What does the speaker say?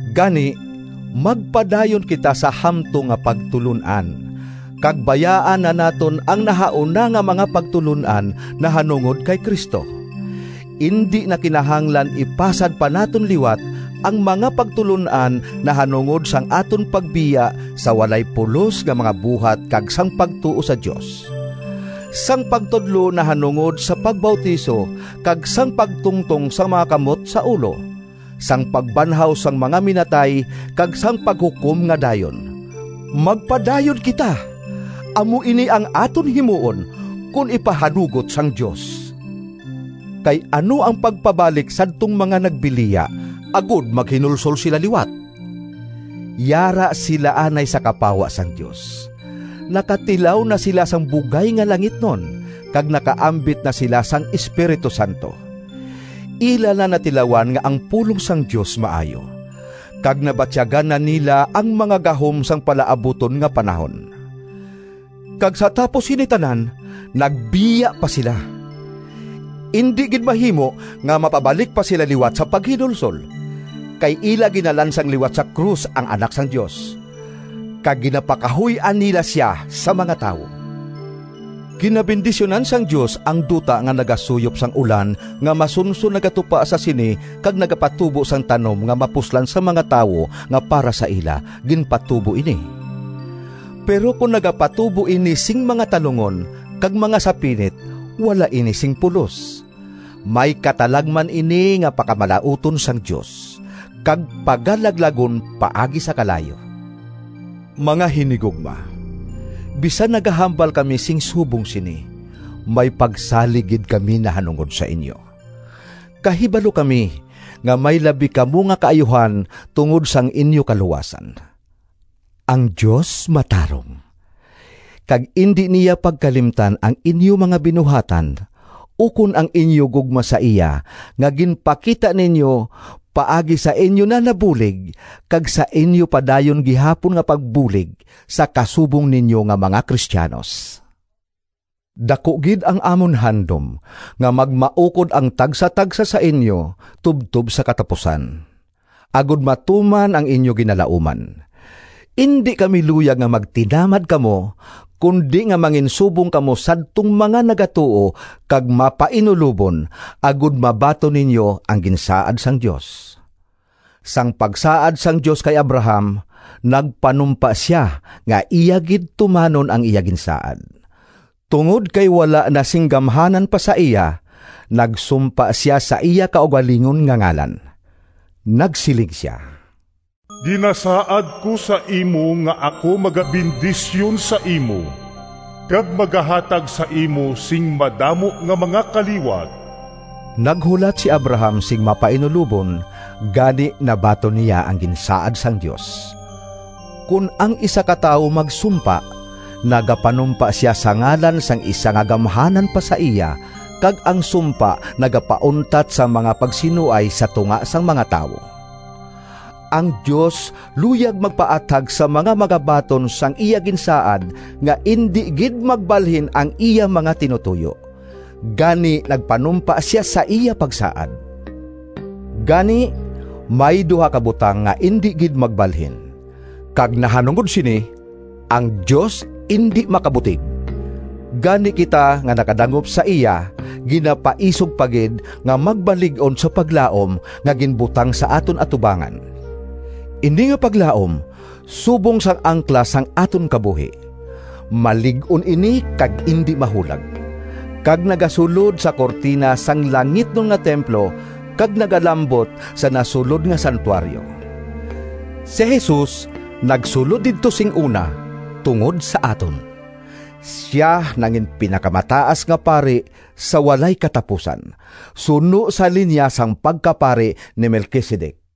Gani magpadayon kita sa hamtong nga pagtulon-an, kag bayaan na naton ang nahauna nga mga pagtulon-an nahanungod kay Cristo. Indi na kinahanglan ipasad pa naton liwat ang mga pagtulon-an nahanungod sang aton pagbiya sa walay pulos nga mga buhat kag sang pagtuo sa Dios; sang pagtudlo nahanungod sa pagbautiso kag sang pagtungtong sang mga kamot sa ulo; sang pagbanhaw sang mga minatay kag sang paghukom nga dayon. Magpadayon kita! Amo ini ang aton himuon, kon ipahanugot sang Dios. Kay ano ang pagpabalik sadtong mga nagbiliya agod maghinulsol sila liwat? Yara sila anay sa kapawa sang Dios. Nakatilaw na sila sang bugay nga langitnon, kag nakaambit na sila sang Espiritu Santo. Ila na natilawan nga ang pulong sang Dios maayo, kag nabatyagan na nila ang mga gahom sang palaabuton nga panahon. Kag sa tapos sini tanan, nagbiya pa sila! Indi gid mahimo nga mapabalik pa sila liwat sa paghinulsol, kay ila ginalansang liwat sa krus ang Anak sang Dios, kag ginapakahuy-an nila sia sa mga tawo. Ginabendisyunan sang Dios ang duta nga nagasuyop sang ulan nga masunson nagatupa sa sini kag nagapatubo sang tanom nga mapuslan sang mga tawo nga para sa ila ginpatubo ini. Pero kon nagapatubo ini sing mga talungon kag mga sapinit wala ini sing pulos. May katalagman ini nga pakamalauton sang Dios, kag pagalaglagon paagi sa kalayo. Mga hinigugma, bisan nagahambal kami sing subong sini, may pagsalig gid kami nahanungod sa inyo. Kahibalo kami nga may labi kamo nga kaayuhan tungod sang inyo kaluwasan. Ang Dios matarong, kag indi niya pagkalimtan ang inyo mga binuhatan, ukon ang inyo gugma sa iya nga ginpakita ninyo paagi sa inyo na nabulig kag sa inyo padayon gihapon nga pagbulig sa kasubong ninyo nga mga Cristianos. Daku gid ang amon handom nga magmaukod ang tagsatagsa sa inyo tubtob sa katapusan, agod matuman ang inyo ginalauman. Indi kami luyag nga magtinamad kamo, kundi nga manginsubong kamo sadtong mga nagatuo kag mapainulobon, agod mabaton ninyo ang ginsaad sang Dios. Sang pagsaad sang Dios kay Abraham, nagpanumpa sia nga iya gid tumanon ang iya ginsaad. Tungod kay wala na sing gamhanan pa sa iya, nagsumpa sia sa iya kaugalingon nga ngalan. Nagsiling sia, “Ginasaad ko sa imo nga ako magabendisyon sa imo kag magahatag sa imo sing madamo nga mga kaliwat.” Naghulat si Abraham sing mapainulobon, gani nabaton niya ang ginsaad sang Dios. Kon ang isa ka tawo magsumpa, nagapanumpa sia sa ngalan sang isa nga gamhanan pa sa iya, kag ang sumpa nagapauntat sang mga pagsinuay sa tunga sang mga tawo. Ang Dios luyag magpaathag sa mga magabaton sang iya ginsaad nga indi gid magbalhin ang iya mga tinutoyo. Gani nagpanumpa sia sa iya pagsaad. Gani, may duha ka butang nga indi gid magbalhin, kag nahanungod sini ang Dios indi makabutig. Gani kita nga nakadangop sa iya ginapaisog pa gid nga magmalig-on sa paglaom nga ginbutang sa aton atubangan. Ini nga paglaom subong sang angkla sang aton kabuhi. Malig-on ini kag indi mahulag, kag nagasulod sa kurtina sang langitnon nga templo kag nagalambot sa nasulod nga santuaryo. Si Jesus nagsulod didto sing una tungod sa aton. Sia nanginpinakamataas nga pari sa walay katapusan, suno sa linya sang pagkapari ni Melquisedec.